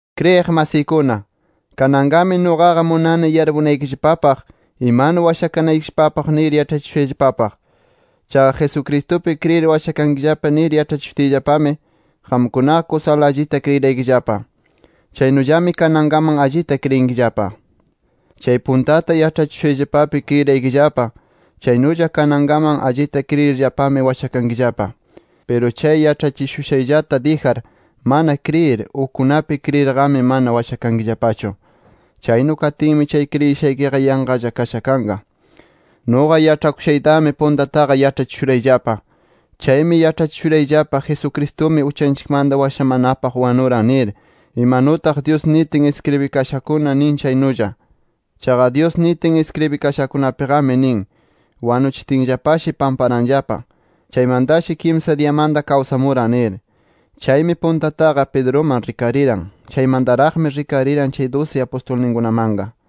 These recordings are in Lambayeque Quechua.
Kriyiq masiykuna, kananqami nuqaqa munani yarpunaykillapapaq imanu washakanaykillapapaq nir yaĉhachishushayllapapaq. Chaqa Jesucristupi kriyir washakankillapa nir yaĉhachishutiyllapami, qamkunaqa kusala allita kriyiraykillapa. Chaynullami kanankaman allita kriyinkillapa. Chay puntata yaĉhachishushayllapapi kriyiraykillapa, chaynulla kanankaman allita kriyirllapami washakankillapa. Piru chay yaĉhachishushayllata dijar mana kriyir, ukkunapi kriyirqami mana washakankillapachu. Chaynu katinmi chay kriyishaykiqa yanqalla kasha kanqa. Nuqa yaĉhakushaytami puntataqa yaĉhachishurayllapa. Chaymi yaĉhachishurayllapa Jesucristumi uchanchikmanta washamanapaq wanuran nir, imanutaq Dyus nitin iskribikashakuna nin chaynulla. Chaqa Dyus nitin iskribikashakunapiqami nin, wanuchitinllapashi pamparanllapa. Chaymantashi kimsa diyamanta kawsamuran nir. Chaymi puntataqa Pedruman rikariran. Chaymantaraqmi rikariran chay dusi apustulninkunamanqa.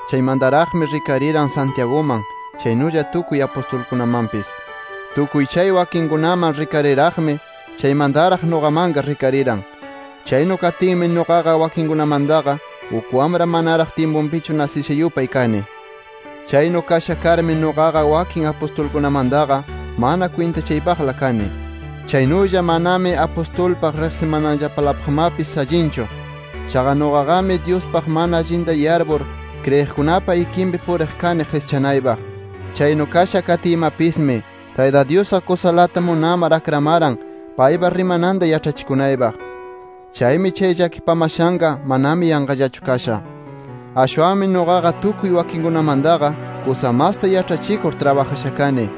Chaymantaraqmi rikariran Santiaguman, chaynulla tukuy apustulkunamanpis. Tukuy chay wakinkunaman rikarir-raqmi, chaymantaraq nuqamanqa rikariran. Chaynu katinmi nuqaqa wakinkunamantaqa, uk wamra manaraq tyimpunpichu nasisha yupay kani. Chaynu kasha karmi nuqaqa wakin apustulkunamantaqa mana kwintachaypaqla kani. Chaynulla manami apustulpaq riqsimananllapalapaqmapis allinchu. Chaqa nuqaqami Dyuspaq mana allinta yarpur, kriyiqkunapa ikinpi puriq kani qischanaypaq. Chaynu kasha katiymapismi, Tayta Dyusqa kusalata munamar akramaran paypa rimananta yaĉhachikunaypaq. Chaymi chay llakipamashanqa manami yanqallachu kasha. Ashwanmi nuqaqa tukuy wakinkunamantaqa kusa masta yaĉhachikur trabajasha kani.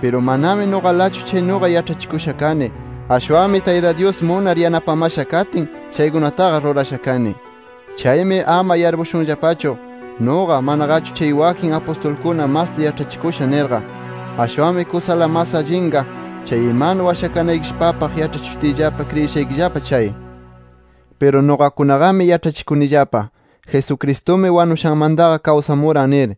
Piru manami nuqalachu chaynuqa yaĉhachikusha kani, ashwanmi Tayta Dyus munar yanapamasha katin chaykunataqa rurasha kani. Chaymi ama yarpushunllapachu, nuqa, manaqachu chay wakin apustulkuna masta yaĉhachikusha nirqa. Ashwanmi kusala mas allinqa chay imanu washakanaykillapapaq yaĉhachishutiyllapa kriyishaykillapa chay. Piru nuqakunaqami yaĉhachikunillapa, Jesucristumi wanushanmantaqa kawsamuran nir.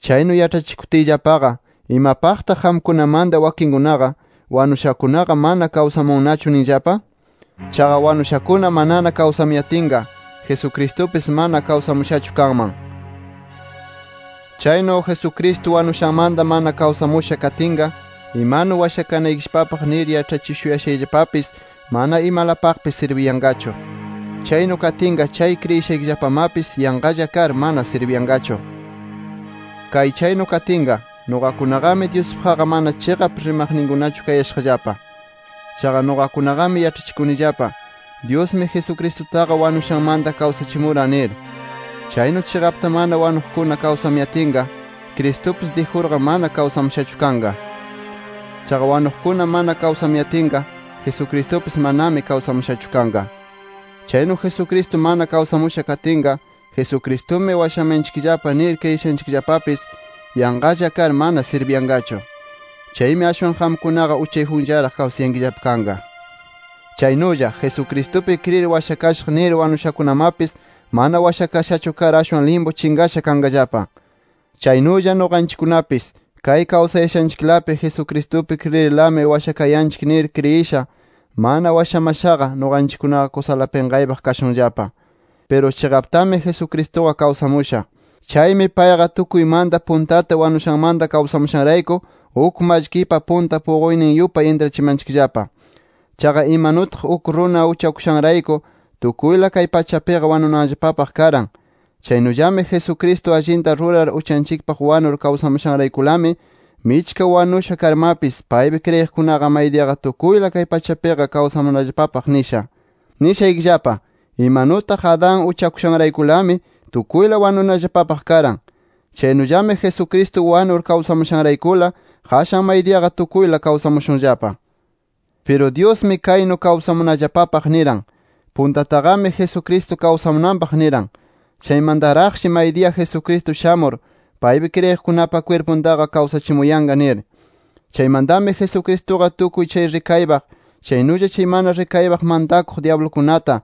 Chaynu yaĉhachikutiyllapaqa, ¿imapaqtaq qamkunamanta wakinkunaqa, wanushakunaqa mana kawsamunnachu ninllapa? Chaqa wanushakuna manana kawsamuyatinqa, Jesucristupis mana kawsamushachu kanman. Chaynu Jesucristo wanushanmanta mana kawsamusha katinqa, imanu washakanaykillapapaq nir yaĉhachishuyashayllapapis mana imalapaqpis sirbiyanqachu. Chaynu katinqa chay kriyishaykillapamapis yanqalla kar, mana sirbiyanqachu. Kay chaynu katinqa, nuqakunaqami Dyuspaqqa mana chiqap rimaqninkunachu kayashaqllapa. Chaqa nuqakunaqami yaĉhachikunillapa, Dyusmi Jesucristutaqa wanushanmanta kawsachimuran nir. Chaynu chiqapta mana wanuqkuna kawsamuyatinqa, Cristupis dijurqa mana kawsamushachu kanqa. Chaqa wanuqkuna mana kawsamuyatinqa, Jesucristupis manami kawsamushachu kanqa. Chaynu Jesucristo mana kawsamusha katinqa, Jesucristumi washamayanchikllapa nir kriyishaykillapapis, yanqalla kar mana sirbiyanqachu. Chaymi ashwan qamkunaqa uchayjunllaraq kawsayankillapa kanqa. Chaynulla, Jesucristupi kriyir washakashaq nir wanushakunamapis, mana washakashachu kar ashwan limpu chinqasha kanqallapa. Chaynulla nuqanchikkunapis, kay kawsayashanchiklapi Jesucristupi kriyirlami washakayanchik nir kriyisha, mana washamashaqa nuqanchikkunaqa kusala pinqaypaq kashunllapa. Piru chiqaptami Jesucristuqa kawsamusha. Chaymi payqa tukuymanta puntata wanushanmanta kawsamushanrayku, uk mallkipa punta puquynin yupay intrachimanchikllapa. Chaqa imanutaq uk runa uchakushanrayku tukuyla kay pachapiqa wanunallapapaq karan. Chaynullami Jesucristo allinta rurar uchanchikpaq wanur kawsamushanraykulami, michka wanusha karmapis, paypi kriyiqkunaqa maydiyaqa tukuyla kay pachapiqa kawsamunallapapaq nisha. Nishaykillapa: Imanutaq Adán uchakusharaykulami tukuyla wanunallapapaq karan. Chaynullami Jesucristo wanur kawsamushanraykula, qashan maydiyaqa tukuyla kawsamushunllapa. Piru Dyusmi kaynu kawsamunallapapaq niran: Puntataqami Jesucristo kawsamunanpaq niran. Chaymantaraqshi maydiya Jesucristo shamur, paypi kriyiqkunapa kwirpuntaqa kawsachimuyanqa nir. Chaymantami Jesucristuqa tukuy chay rikaypaq, chaynulla chay mana rikaypaq mantakuq dyablukunata,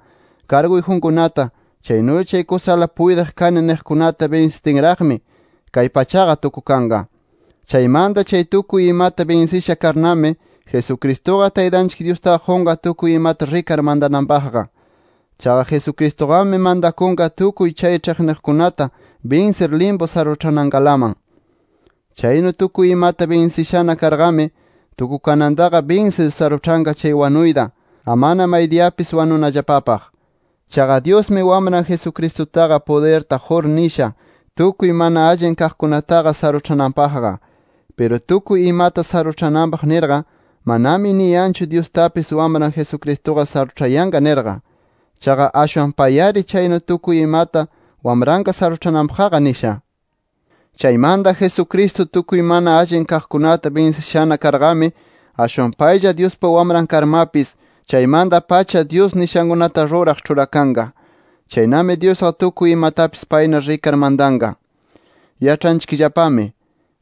karguyjunkunata, chaynulla chay kusala puytiq kani niqkunata binsitinraqmi, kay pachaqa tukukanqa. Chaymanta chay tukuy imata binsisha karnami, Jesucristuqa Taytanchik Dyustaqa qunqa tukuy imata rikar mantananpaqqa. Chaqa Jesucristuqami mantakunqa tukuy chay ĉhiqniqninkunata binsir limpu saruĉhanankalaman. Chaynu tukuy imata binsishana karqami, tukukanantaqa binsir saruĉhanqa chay wanuyta, amana maydiyapis wanunallapapaq. Chaqa Dyusmi Wamran Jesucristutaqa pudirta qur nisha tukuy mana allin kaqkunataqa saruĉhananpaqqa. Piru tukuy imata saruĉhananpaq nirqa, manami niyanchu Dyustapis Wamran Jesucristuqa saruĉhayanqa nirqa. Chaqa ashwan pay-ari chaynu tukuy imata Wamranqa saruĉhananpaqqa nisha. Chaymanta Jesucristo tukuy mana allin kaqkunata binsishana karqami, ashwan paylla Dyuspa Wamran karmapis chaymanta-pacha, Dyus nishankunata ruraq ĉhurakanqa. Chaynami Dyusqa tukuy imatapis payna rikar mantanqa. Yaĉhanchikllapami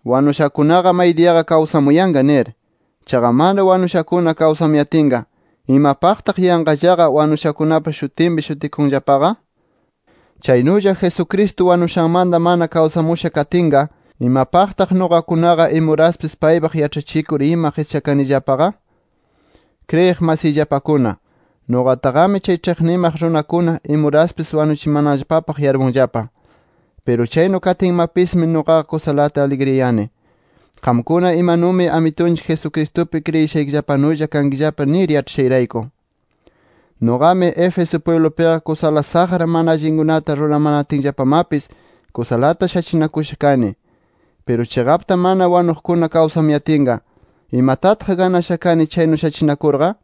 wanushakunaqa maydiyaqa kawsamuyanqa nir. Chaqa mana wanushakuna kawsamuyatinqa, ¿imapaqtaq yanqallaqa wanushakunapa shutinpi shutikunllapaqa? Chaynulla Jesucristo wanushanmanta mana kawsamusha katinqa ¿imapaqtaq nuqakunaqa imuraspis paypaq yaĉhachikur ima qischakanillapaqa? Kriyiq masiyllapakuna, nuqataqami chay ĉhiqnimaq runakuna imuraspis wanuchimananllapapaq yarpunllapa. Piru chaynu katinmapismi nuqaqa kusalata aligriyani, qamkuna imanumi Amitunchik Jesucristupi kriyishaykillapanulla kankillapa nir yaĉhashayrayku. Nuqami Éfeso pwiblupiqa kusala saqra mana allinkunata ruramanatinllapamapis kusalata shachinakusha kani. Piru chiqapta mana wanuqkuna kawsamuyatinqa, ¿imatataq ganasha kani chaynu shachinakurqa?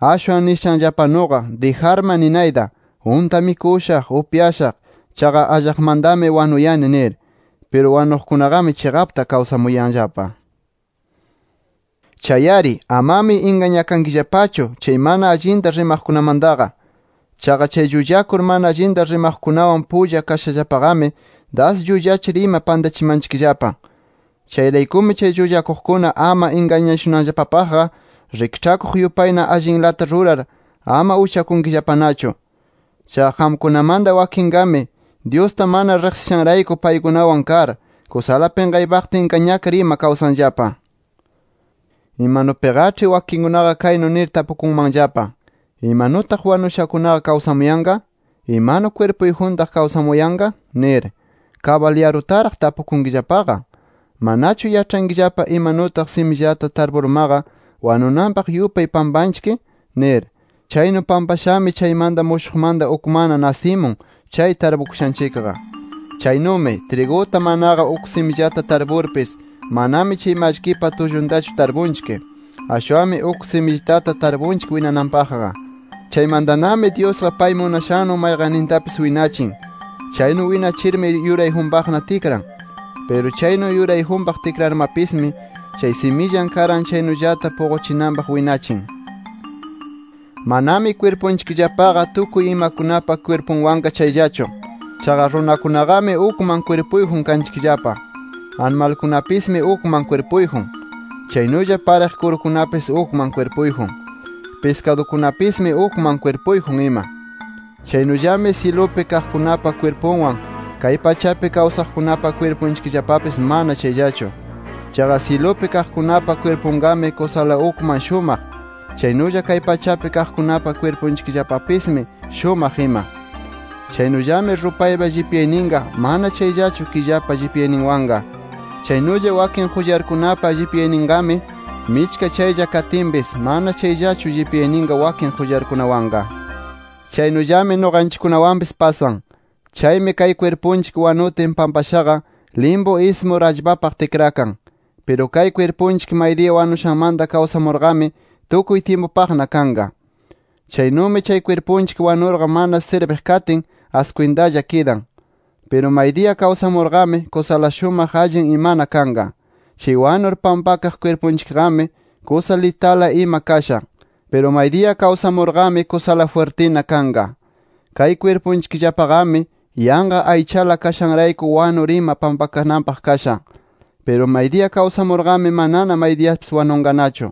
Ashwan nishanllapanuqa dijarma ninayta: Unta mikushaq, upyashaq, chaqa allaqmantami wanuyani nir. Piru wanuqkunaqami chiqapta kawsamuyanllapa. Chay-ari amami ingañakankillapachu chay mana allinta rimaqkunamantaqa. Chaqa chay llullakur mana allinta rimaqkunawan pulla kashallapaqami das llullachir ima pantachimanchikllapa. Chayraykumi chay llullakuqkuna ama ingañashunanllapapaqqa rikĉhakuq yupayna allinlata rurar, ama uchakunkillapanachu. Chaqa qamkunamanta wakinqami, Dyusta mana riqsishanrayku, paykunawan kar, kusala pinqaypaqta ingañakar ima kawsanllapa. Imanupiqaĉhi wakinkunaqa kaynu nir tapukunmanllapa: ¿Imanutaq wanushakunaqa kawsamuyanqa? ¿Imanu kwirpuyjuntaq kawsamuyanqa? nir. ¡Kabal yarutaraq tapukunkillapaqa! ¿Manachu yaĉhankillapa, imanutaq simillata tarpurmaqa wanunanpaq yupay pampanchik? nir. Chaynu pampashami chaymanta mushuqmanta ukmanna nasimun chay tarpukushanchikqa. Chaynumi triguta manaqa uk simillata tarpurpis, manami chay mallkipa tulluntachu tarpunchik. Ashwanmi uk simillitata tarpunchik winananpaqqa. Chaymantanami Dyusqa pay munashannu mayqannintapis winachin. Chaynu winachirmi, yurayjunpaqna tikran. Piru chaynu yurayjunpaq tikrarmapismi chay simillan karan chaynullata puquchinanpaq winachin. Manami kwirpunchikllapaqa tukuy imakunapa kwirpunwanqa chayllachu. Chaqa runakunaqami ukman kwirpuyjun kanchikllapa. Animalkunapismi ukman kwirpuyjun. Chaynulla pariq kurukunapis ukman kwirpuyjun. Piskadukunapismi ukman kwirpuyjun ima. Chaynullami syilupi kaqkunapa kwirpunwan, kay pachapi kawsaqkunapa kwirpunchikllapapis mana chayllachu. Chaqa syilupi kaqkunapa kwirpunqami kusala ukman shumaq, chaynulla kay pachapi kaqkunapa kwirpunchikllapapismi shumaq ima. Chaynullami rupaypa llipyayninqa, mana chayllachu killapa llipyayninwanqa. Chaynulla wakin qullarkunapa llipyayninqami, michka chaylla katinpis, mana chayllachu llipyayninqa wakin qullarkunawanqa. Chaynullami nuqanchikkunawanpis pasan. Chaymi kay kwirpunchik wanutin pampashaqa, limpu ismur allpapaq tikrakan. Piru kay kwirpunchik maydiya wanushanmanta kawsamurqami, tukuy tyimpupaqna kanqa. Chaynumi chay kwirpunchik wanurqa mana sirbiq katin, askwintalla kidan. Piru maydiya kawsamurqami, kusala shumaq allin imana kanqa. Chay wanur pampakaq kwirpunchikqami, kusa litala ima kasha. Piru maydiya kawsamurqami, kusala jwirtina kanqa. Kay kwirpunchikllapaqami, yanqa aychala kashanrayku wanur ima pampakananpaq kasha. Piru maydiya kawsamurqami, manana maydiyapis wanunqanachu.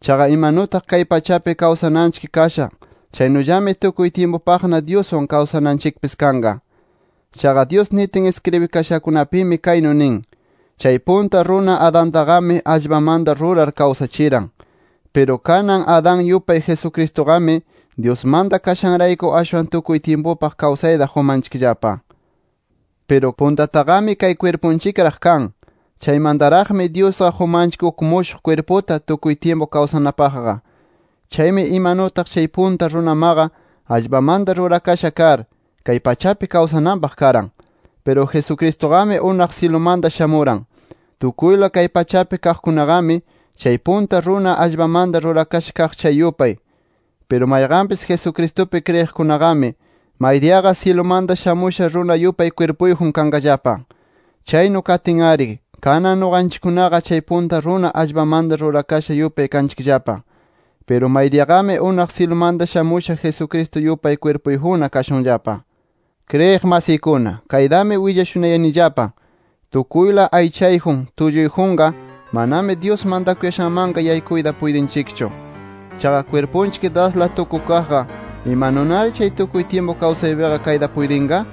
Chaqa imanutaq kay pachapi kawsananchik kasha, chaynullami tukuy tyimpupaqna Dyuswan, kawsananchikpis kanqa. Chaqa Dyus nitin iskribikashankunapimi kaynu nin: “Chay punta runa Adantaqami allpamanta rurar kawsachiran”. Piru kanan Adán yupay Jesucristuqami, Dyusmanta kashanrayku ashwan tukuy tyimpupaq kawsayta qumanchikllapa. Piru, puntataqami kay kwirpunchikraq kan. Chaymantaraqmi Dyusqa qumanchik uk mushuq kwirputa tukuy tyimpu kawsanapaqqa. Chaymi imanutaq chay punta runamaqa allpamanta rurasha kar, kay pachapi kawsananpaq karan. Piru Jesucristuqami unaq syilumanta shamuran. Tukuyla kay pachapi kaqkunaqami, chay punta runa allpamanta rurakasha kaq chay yupay. Piru mayqanpis Jesucristupi kriyiqkunaqami, maydiyaqa syilumanta shamusha runa yupay kwirpuyjun kanqallapa. Chaynu katin-ari, kanan nuqanchikkunaqa chay punta runa allpamanta rurakasha yupay kanchikllapa. Piru maydiyaqami, unaq syilumanta shamusha Jesucristo yupay kwirpuyjunna kashunllapa. Kriyiq masiykuna kaytami willashunayanillapa: Tukuyla aychayjun, tulluyjunqa manami Dyus mantakuyashanmanqa yaykuyta puytinchikchu. Chaqa kwirpunchik dasla tukukaqqa, ¿imanunari chay tukuy tyimpu kawsaqpiqa kayta puytinqa?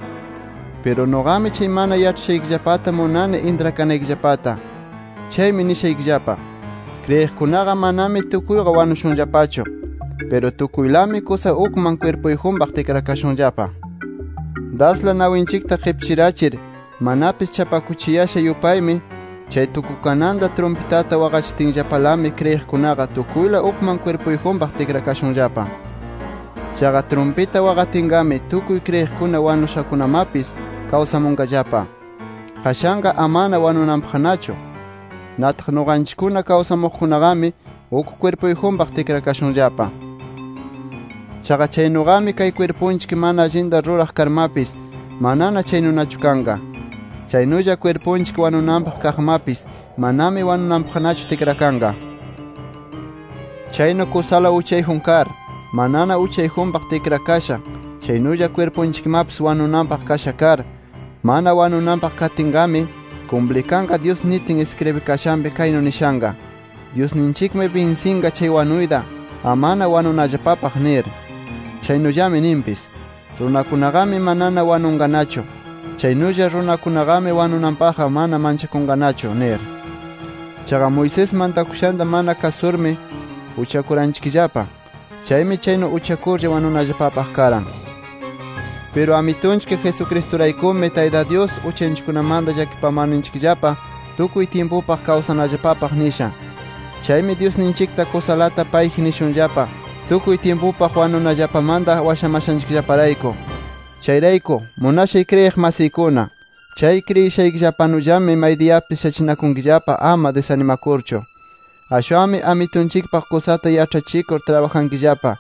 Piru nuqami chay mana yaĉhayashaykillapata munani intrakanaykillapata. Chaymi nishaykillapa: Kriyiqkunaqa manami tukuyqa wanushunllapachu. Piru tukuylami kusa ukman kwirpuyjunpaq tikrakashunllapa. Dasla nawinchikta qipchirachir, manapis chapakuchiyasha yupaymi, chay tukukananta trumpitata waqachitinllapalami kriyiqkunaqa tukuyla ukman kwirpuyjunpaq tikrakashunllapa. Chaqa trumpita waqatinqami, tukuy kriyiqkuna wanushakunamapis kawsamunqallapa, qashanqa amana wanunanpaqnachu. Nataq nuqanchikkuna kawsaqkunaqami, uk kwirpuyjunpaq tikrakashunllapa. Chaqa chaynuqami kay kwirpunchik mana allinta ruraq karmapis, manana chaynunachu kanqa. Chaynulla kwirpunchik wanunanpaq kaqmapis, manami wanunanpaqnachu tikrakanqa. Chaynu kusala uchayjun kar, manana uchayjunpaq tikrakasha, chaynulla kwirpunchikmapis wanunanpaq kasha kar, mana wanunanpaq katinnaqami, kumplikanqa Dyus nitin iskribikashanpi kaynu nishanqa: “Dyusninchikmi binsinqa chay wanuyta, amana wanunallapapaq” nir. Chaynulla ninpis: ¡Runakunaqami manana wanunqanachu! ¡Chaynulla runakunaqami wanunanpaqqa mana manchakunqanachu! nir. Chaqa Moisés mantakushanta mana kasurmi uchakuranchikllapa. Chaymi chaynu uchakurlla wanunallapapaq karan. ¡Piru Amitunchik Jesucristuraykumi Tayta Dyus uchanchikkunamanta llakipamarninchikllapa tukuy tyimpupaq kawsanallapapaq nisha! ¡Chaymi Dyusninchikta kusalata payji nishunllapa, tukuy tyimpupaq wanunallapamanta washamashanchikllaparayku! Chayrayku, munashay kriyiq masiykuna, chay kriyishaykillapanullami maydiyapis shachinakunkillapa, amana disanimakurchu. Ashwanmi Amitunchikpaq kusata yaĉhachikur trabajankillapa.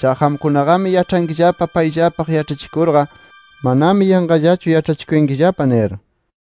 Chaqa qamkunaqami yaĉhankillapa payllapaq yaĉhachikurqa, manami yanqallachu yaĉhachikuyankillapa nir.